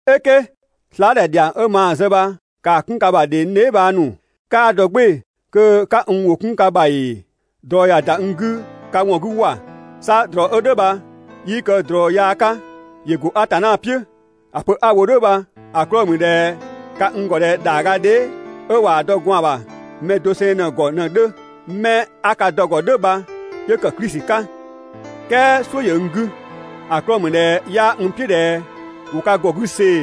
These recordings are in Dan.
"Eke, slaadhɛ ‑dhiang 'ö maa‑ zë bha ‑kaa 'kun ka ‑bha ‑dhe n dheebhang ‑nu. 'Kaa ‑dɔ "gbɩɩ‑ kö 'ka n ‑wʋ 'kun ka ‑bha ‑ee! ꞊Drɔ ꞊ya ‑da n 'gü ka ‑wɔn 'gü ‑wa! 'Sa ꞊drɔ 'ö "dhʋ̈ bha 'yii kë ꞊drɔ yaa 'ka, ‑yö ‑go Atanna "piʋ̈. ‑A pö 'a‑ wo "dhʋ̈ bha‑ 'klɔɔ‑ ‑mü ꞊dhɛ ka n ‑gɔ ꞊dhɛ ‑dhaagadhee 'ö ꞊waa‑ dɔ gwaan‑ ‑bha mɛ doseng ꞊në‑ ‑gɔ ꞊në‑ 'dhö, 'mɛ 'a ka dɔ‑ ‑gɔ "dhʋ̈ bha 'yö ‑kë Klisi 'ka. "Kɛɛ "suʋ̈ ‑yö n 'gü, ‑a 'klɔɔ‑ ‑mü ꞊dhɛ 'yaa n "piʋ̈ ꞊dhɛ ‑wo ka ‑gɔ 'gü see‑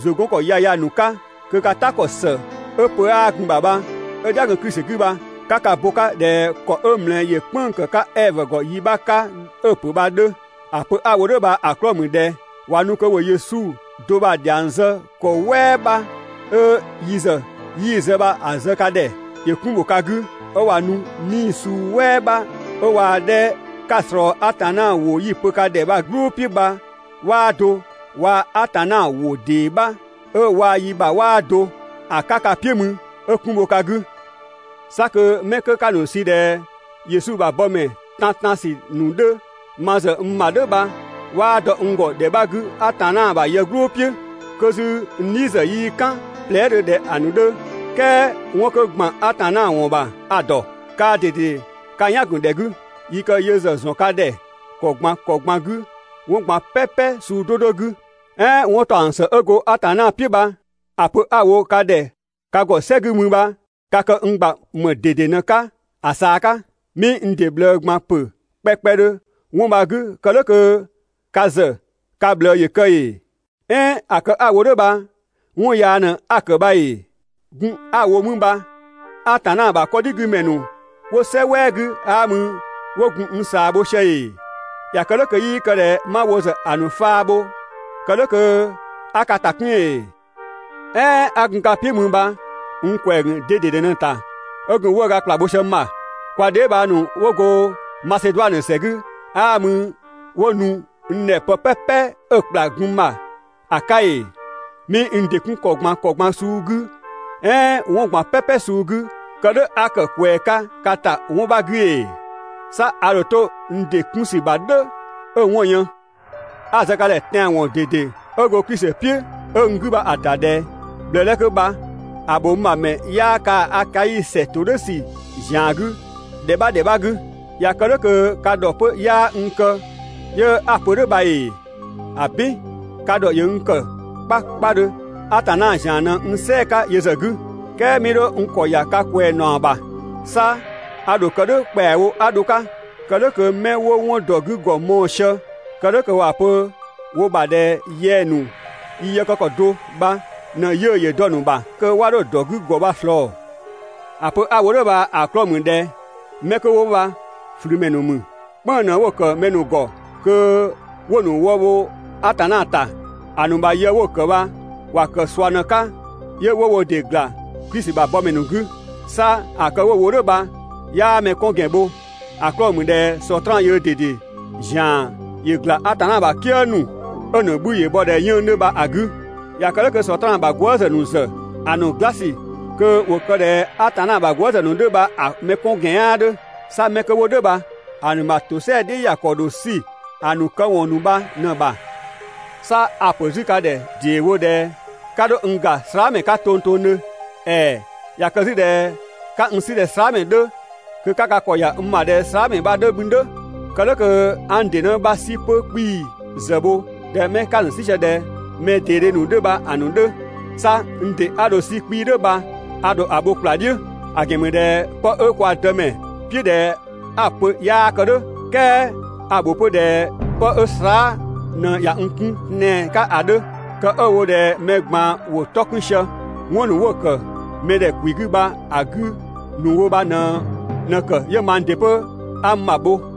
‑zʋ 'gɔn ‑kɔ yaya ‑nu 'ka kö ka "ta ‑kɔ ‑së 'ö pö 'aa gun‑ ‑bha, 'ö‑ "dhia‑ gun Klisi 'gü bha 'ka ka bo‑ 'ka ꞊dhɛ ‑kɔ 'ö ꞊mlɛ ‑yö "kpënng‑ ‑kë 'ka 'Ɛvö ‑gɔ yi 'bha 'ka 'ö‑ ‑pö bha‑ 'dhö. ‑A pö 'a‑ wo "dhʋ̈ bha‑ 'klɔɔ‑ ‑mü ꞊dhɛ ꞊wa nu kö ‑wo Yesu do bha‑ ‑dhiang zë ‑kɔ "wɛɛ 'bha, 'ö yi ‑zë 'yii zë bha‑ zë ka ‑dhɛ, ‑yö 'kun ‑bho ka 'gü, 'ö ꞊wa nu 'nii‑ suu "wɛɛ 'bha 'ö waa‑ 'dhɛ 'ka‑ ꞊slɔɔ Atanna ‑wʋ 'yi‑ pö ka ‑dhɛ bha‑ "gblʋ "piʋ̈ bha 'waa do, waa Atanna ‑wʋ ‑dee 'bha 'ö waa‑ yi ‑bha 'waa do ‑a 'ka ka "piʋ̈ mü 'ö 'kun bho ka 'gü. 'Sa kö 'mɛ 'kö 'ka‑ ‑nu sü ꞊dhɛ Yesu ‑bha bɔmɛ tantan ‑sü ‑nu 'dhö ma ‑zë n ‑bha "dhʋ̈ bha 'waa dɔ n ‑gɔ ‑dhɛ 'bha 'gü Atanna ‑bha yë "gblʋ "piʋ̈. 'Kö 'zü n "dhi ‑zë 'yii "kan plɛɛ" dhö ꞊dhɛ‑ ‑nu 'dhö, "kɛɛ 'wɔn kö ‑gban Atanna ‑wɔn ‑bha a‑ ‑dɔ. Kaa ꞊dede ka "yan‑ ‑gun ‑dhɛ 'gü, yi kë yö ‑zë ‑zɔn ka ‑dhɛ ‑kɔ ꞊gban ‑kɔ ꞊gban 'gü 'wɔn ꞊gban "pɛpɛ suu 'do 'do 'gü. "Ɛɛn 'wɔntaɔngsë 'ö go Atanna "piʋ̈ bha‑ pö 'a‑ wo ka ‑dhɛ ka ‑gɔ "sɛ 'gü mü bha ka kë n ‑gba ‑më ꞊dede 'pö‑ 'ka ‑a ꞊saa 'ka? 'Mii n ‑dɩ ꞊bhlë ꞊gban ‑pö kpɛkpɛdhö 'wɔn bha‑ 'gü kë "dhʋ̈ kö ka ‑zë ka ꞊bhlë ‑yö kë ‑ee? "Ɛɛn ‑a kë 'a‑ wo "dhʋ̈ bha 'wɔn yaa ꞊në 'a‑ ‑kë bha ‑ee? Gun 'a‑ wo mü bha Atanna ‑bha 'kɔdhigümɛ ‑nu 'wo "sɛ "wɛɛ 'gü 'aa mü 'wo gun n ꞊saa bho sië ‑ee? ꞊Ya kë "dhʋ̈ kö 'yii kë ꞊dhɛ 'ma wo ‑zë ‑a ‑nu faa bho, kë "dhʋ̈ kö 'a ka ‑ta 'kun ‑ee? "Ɛɛn 'a gun ka "piʋ̈ mü bha n ‑kwɛɛ ‑gun de ꞊dede 'pö‑ 'ta 'ö gun 'wëëga ‑kpla bho sië n ‑bha? Kwa dheebhang ‑nu 'wo go Maseduanö ‑sɛ 'gü 'aa mü 'wo nu n ‑dhɛ pë "pɛpɛ 'ö‑ ‑kpla gun n ‑bha ‑a 'ka ‑ee? 'Mii n ‑dɩ 'kun ‑kɔ ꞊gban ‑kɔ ꞊gban suu 'gü "ɛɛn 'wɔn ꞊gban "pɛpɛ suu 'gü kë "dhʋ̈ 'a ‑kë ꞊kwɛɛ 'ka ka ‑ta 'wɔn 'bha 'gü ‑ee? 'Sa a ‑dho 'to n ‑dɩ 'kun ‑sü ‑bha "dhʋ̈ 'ö‑ 'wɔn‑ yën. 'A‑ zë ka ‑dhɛ tɛanwɔn ꞊dede 'ö go Klisi "piʋ̈ 'ö n 'gü bha‑ ‑ta ꞊dhɛ: ꞊Bhlë 'dhɛ 'kö bha‑ ‑bho n ‑bha ‑mɛ 'yaa kaa‑ Akai ‑sɛ 'to "dhʋ̈ ‑sü ‑zian 'gü ‑dhɛ 'bha ‑dhɛ 'bha 'gü. ꞊Ya kë "dhʋ̈ kö ka ‑dhɔ 'pö 'yaa n kë 'yö 'a‑ pö "dhʋ̈ bha ‑ee? ‑Abin! Ka ‑dhɔ ‑yö n ‑kë 'kpakpadhö, Atanna ‑zian ꞊në n "sɛɛ‑ 'ka yö ‑zë 'gü. "Kɛɛ 'mii 'dho n ‑kɔ ‑ya ka ꞊kwɛɛ ‑naɔ ‑bha, 'sa a 'dho‑ kë "dhʋ̈ ‑kpɛawo 'a dho‑ 'ka, kë "dhʋ̈ kö 'mɛ 'wo 'wɔn ‑dɔ 'gü ‑gɔ mɔɔ‑ sië kë "dhʋ̈ kö ‑wa pö wo ‑bha ꞊dhɛ yɛng‑ ‑nu yi yë kë ‑kɔ do bha ꞊në 'yiʋ̈‑ ‑yö dɔ‑ ‑nu ‑bha kö 'wa 'dho‑ ‑dɔ 'gü ‑gɔ bha‑ ꞊slɔɔ. ‑A pö 'a‑ wo "dhʋ̈ bha‑ 'klɔɔ‑ ‑mü ꞊dhɛ 'mɛ 'kö 'wo bha ꞊flümɛ ‑nu ‑mü, "kpënng‑ ꞊në 'wo‑ ‑kë mɛ ‑nu ‑gɔ kö 'wo‑ ‑nu wë bho Atanna ‑ta. ‑A ‑nu ‑bha yë 'wo‑ ‑kë bha ‑wa ‑kë ꞊sua ꞊në‑ 'ka 'yö 'wo wo ‑dɩ ꞊gla Klisi ‑bha bɔmɛ ‑nu 'gü. 'Sa ‑a kë 'wo‑ wo "dhʋ̈ bha 'yaa mɛ 'kɔn ‑gɛn bho, ‑a 'klɔɔ‑ ‑mü ꞊dhɛ Sɔtraan yöö ꞊dede ‑zian ‑yö ‑gla Atanna ‑bha "kië ‑nu 'ö‑ ‑nu bhü‑ bhɔ ꞊dhɛ 'yën‑ 'dhö bha‑ 'gü. ꞊Ya kë "dhʋ̈ kö Sɔtraan ‑bha gwëëzë ‑nu ‑zë ‑a ‑nu "gla ‑sü kö ‑wo kë ꞊dhɛ Atanna ‑bha gwëëzë ‑nu 'dhö kö bha‑ mɛ 'kɔn ‑gɛn 'yaa 'dhö. 'Sa 'mɛ 'wo "dhʋ̈ bha‑ ‑nu ‑bha ‑tosɛa "dhiʋ̈ ‑ya ‑kɔ ‑dho 'sü‑ ‑nu këwɔn ‑nu bha ꞊në‑ ‑bha. 'Sa a‑ ‑pö 'zü ka ‑dhɛ ‑dee wo ꞊dhɛ 'ka 'dho n ‑ga slaamɛ 'ka tongtongdhö. ‑Ɛɛ! ꞊Ya kë 'zü ꞊dhɛ 'ka n 'sü ꞊dhɛ slaamɛ 'dhö, kö 'ka ka ‑kɔ ‑ya n ‑bha ꞊dhɛ slaamɛ bha‑ 'dhö mü "dhʋ̈, kë "dhʋ̈ kö 'a n ‑dɩ 'në 'bha 'sü 'pö 'kpii‑ ‑zë bho ꞊dhɛ 'mɛ 'ka‑ ‑nu 'sü sië ꞊dhɛ mɛ ꞊deedhe ‑nu 'dhö bha‑ ‑nu 'dhö. 'Sa n ‑dɩ 'a dho‑ 'sü 'kpii‑ "dhʋ̈ bha a‑ ‑bho ‑kpla "dhiʋ̈. ‑A ‑gɛn ‑mü ꞊dhɛ 'pë 'ö kwa Dëmɛ "piʋ̈ ꞊dhɛ 'a‑ pö 'yaa kë "dhʋ̈, "kɛɛ a‑ ‑bho 'pö ꞊dhɛ 'pë 'ö slaa" ꞊në ꞊ya n 'kun tɛan‑ 'ka ‑a 'dhö. Kë 'ö‑ wo ꞊dhɛ mɛ ꞊gban ‑wo 'tɔ 'kun sië 'wɔn ‑nu 'wo‑ ‑kë mɛdhɛkwi 'gü bha‑ 'gü ‑nu wo bha ꞊në‑ ‑kë 'yö mang ‑dɩ 'pö 'a n ‑bha bho.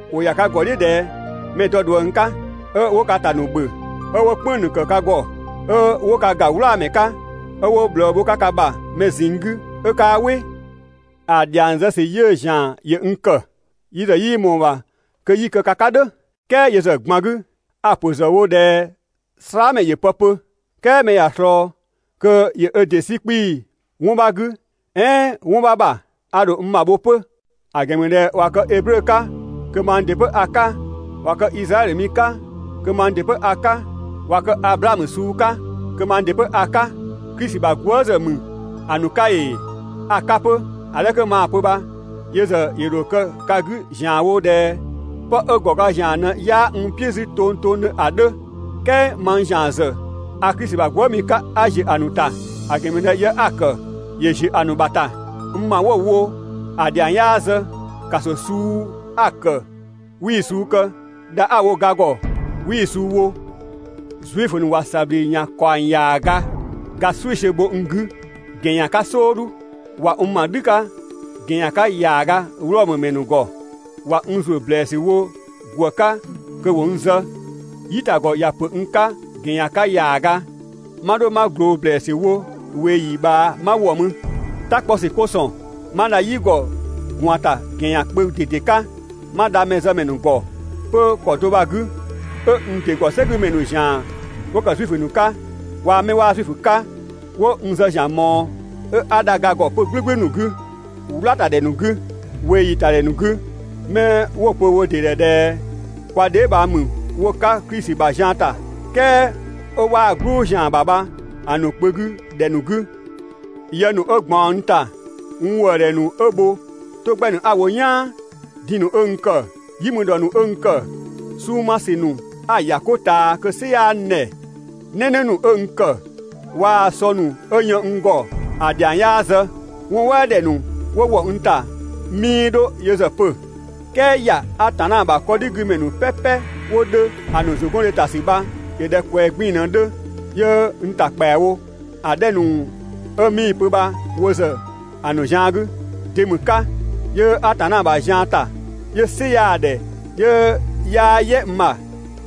‑Wo ‑ya ka ‑gɔ "dhiʋ̈ ꞊dhɛ mɛ‑ dɔ ꞊dhuëng 'ka, 'ö 'wo ka ‑ta ‑nu ‑bhö, 'ö 'wo "kpënng‑ ‑nu ‑kë ka ‑gɔ, 'ö 'wo ka ‑ga "wlaamɛ 'ka, 'ö 'wo ꞊bhlë bho ka ‑bha mɛ ꞊zinng 'gü 'ö 'kaa "wɩ. ‑A ‑dhiang zë ‑sü 'yiʋ̈‑ ‑zian ‑yö n ‑kë. Yi zë 'yii ꞊mɔɔ‑ ‑bha kö 'yi‑ kë ka 'ka "dhʋ̈. "Kɛɛ yö ‑zë ꞊gban 'gü, a‑ ‑pö ‑zë wo ꞊dhɛ slaamɛ ‑yö pë pö, "kɛɛ mɛ ꞊ya ꞊slɔɔ kö ‑yö ö ‑dɩ 'sü 'kpii‑ 'wɔn 'bha 'gü "ɛɛn 'wɔn 'bha ‑bha, a ‑dho n ‑bha bho 'pö. ‑A ‑gɛn ‑mü ꞊dhɛ ꞊wa kë Eblö 'ka, kö mang ‑dɩ 'pö a‑ 'ka, ꞊wa kë Izraɛdhö mi 'ka, kö mang ‑dɩ 'pö a‑ 'ka, ꞊wa kë Ablamö suu ‑nu 'ka, kö mang ‑dɩ 'pö a‑ 'ka, Klisi ‑bha gwëëzë ‑mü ‑a ‑nu 'ka ‑ee? A‑ 'ka 'pö, ‑a 'dhɛ 'kö maa‑ pö bha yö ‑zë ‑yö ‑dho kë ka 'gü ‑zianwo ꞊dhɛ 'pë 'ö ‑gɔ ga ‑zian ꞊në 'yaa n "piʋ̈ 'zü tongtongdhö ‑a 'dhö, "kɛɛ mang ‑zian ‑zë ‑a Klisi ‑bha gwëëmi 'ka 'a ‑ziö ‑a ‑nu ‑ta. ‑A ‑gɛn ‑mü ꞊dhɛ yë 'a‑ ‑kë ‑yö ‑ziö ‑a ‑nu ‑bha ‑ta. N ‑ma 'wo‑ wo ‑a ‑dhiang 'yaa zë, ‑kaso suu 'a‑ ‑kë 'wii‑ suu kë, dha 'a‑ wo ga ‑gɔ, 'wii‑ suu wo. Zuifö ‑nu ꞊wa ‑sabhlü ‑yan ‑kaɔng ‑yaaga ga "sɛisiö bho n 'gü ‑gɛn ‑yan 'ka "sɔɔdhu. ꞊Wa n ‑ma "dhü 'ka ‑gɛn ‑yan 'ka ‑yaaga Wlɔmö ‑mɛ ‑nu ‑gɔ, ꞊wa n ‑zuö ‑blɛɛsü wo ‑gwë 'ka kö ‑wo n zë, "yitagɔ ꞊ya ‑pö n 'ka ‑gɛn ‑yan 'ka ‑yaaga, 'ma 'dho 'ma ꞊gloo ‑blɛɛsü wo ‑kɔɔyi ꞊bhaa 'ma wɔ mü. "Ta 'kpɔ ‑sü 'ko ‑sɔn, 'ma dha "yi ‑gɔ ꞊gwaan ‑ta ‑gɛn ‑yan kpö ꞊dede 'ka, 'ma dha mɛzëmɛ ‑nu ‑gɔ 'pö ‑kɔ do bha‑ 'gü, 'ö n ‑dɩ ‑gɔ "sɛgümɛ ‑nu ‑zian 'wo ‑kë Zuifö ‑nu 'ka waa‑ 'mɛ 'waa Zuifö 'ka 'wo n zë ‑zian ꞊mɔɔ, 'ö 'a dha ga ‑gɔ 'pö‑ 'gbɛgbɛ ‑nu 'gü, "wlatadhɛ ‑nu 'gü, ꞊weeyi ‑tadhɛ ‑nu 'gü, 'mɛ 'wo‑ pö wo ‑dɩ ‑dhɛ ꞊dhɛ kwa dheebhang ‑mü ‑wo 'ka Klisi ‑bha zian ‑ta, "kɛɛ 'ö 'waa‑ "gblʋ ‑zian ‑bha bha‑ ‑nu kpö 'gü ‑dhɛ ‑nu 'gü. Yë ‑nu 'ö ꞊gbaɔn n ‑ta, n ‑wëëdhɛ ‑nu 'ö bho, 'to 'gbɛ ‑nu 'a‑ wo "yaan, diin‑ ‑nu 'ö n ‑kë, "yi mü ‑dhɔ ‑nu 'ö n ‑kë, 'sunng‑ 'ma ‑sü ‑nu 'a‑ ‑ya 'ko ꞊taa kö‑ "sɩ 'yaa n ‑dhɛ, "nɛnɛ ‑nu 'ö n ‑kë, waa‑ sɔ ‑nu 'ö yën n ‑gɔ ‑a ‑dhiang 'yaa zë. 'Wɔn "wɛɛ ‑dhɛ ‑nu 'wo ‑wɔ n ‑ta 'mii 'dho yö ‑zë pö, "kɛɛ ‑ya Atanna ‑bha 'kɔdhigümɛ ‑nu "pɛpɛ 'wo 'dhö ‑a ‑nu ‑zʋgɔndhe ‑ta ‑sü bha ‑yö ꞊dhɛ ꞊kwɛɛ 'gbiin‑ ꞊në‑ 'dhö 'yö n ‑ta ‑kpɛawo ‑a 'dhɛ ‑nu 'ö 'mii‑ pö bha wo ‑zë ‑a ‑nu zian 'gü. De ‑mü 'ka 'yö Atanna ‑bha zian ‑ta 'yö "sɩ 'yaa‑ ‑dhɛ 'yö 'yaa "yɛ n ‑bha,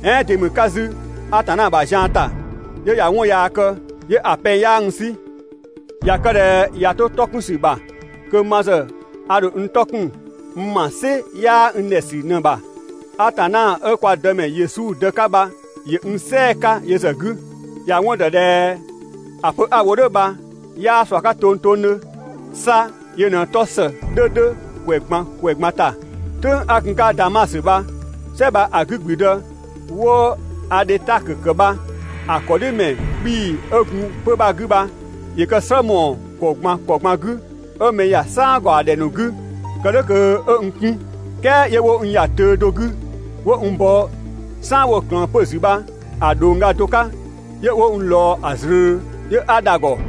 "ɛɛn de ‑mü 'ka 'zü Atanna ‑bha zian ‑ta 'yö ꞊ya 'wɔn yaa kë, 'yö‑ pɛng 'yaa n 'sü. ꞊Ya kë ꞊dhɛ ꞊ya 'to 'tɔ 'kun ‑sü ‑bha, kö ma ‑zë a ‑dho n 'tɔ 'kun n ‑ma "sɩ 'yaa n ‑dhɛ ‑sü ꞊në ‑bha. Atanna 'ö kwa Dëmɛ Yesu Dë 'ka bha ‑yö n "sɛɛ‑ 'ka yö ‑zë 'gü. ‑Ya 'wɔn ‑dɔ ꞊dhɛ ‑a pö 'a‑ wo "dhʋ̈ bha 'yaa ꞊sua 'ka tongtongdhö. 'Sa yö ꞊në‑ 'tɔ ‑së 'dhö 'dhö ‑kwɛ ꞊gban ‑kwɛ ꞊gban ‑ta. "Tʋ̈ng 'a gun‑ 'ka Damasö bha, "sɛ bha‑ 'gü ‑gblüdë 'wo‑ Adhetakö ‑kë bha‑ ‑kɔ "dhiʋ̈ ‑mɛ 'kpii‑ 'ö gun 'pö‑ bha‑ 'gü bha, ‑yö kë‑ "slë ‑mɔɔ ‑kɔ ꞊gban ‑kɔ ꞊gban 'gü, 'ö mɛ ‑ya "saan ‑gaɔ ‑dhɛ ‑nu 'gü kë "dhʋ̈ kö 'ö n 'kun. "Kɛɛ 'yö 'wo n ‑ya töö do 'gü 'wo n bɔ "saan 'wo‑ ꞊klëën 'pö‑ ‑zü bha‑ ꞊dhongga do 'ka 'yö 'wo n ꞊lɔɔ ‑a ꞊zlöö, 'yö 'a dha‑ ‑gɔ.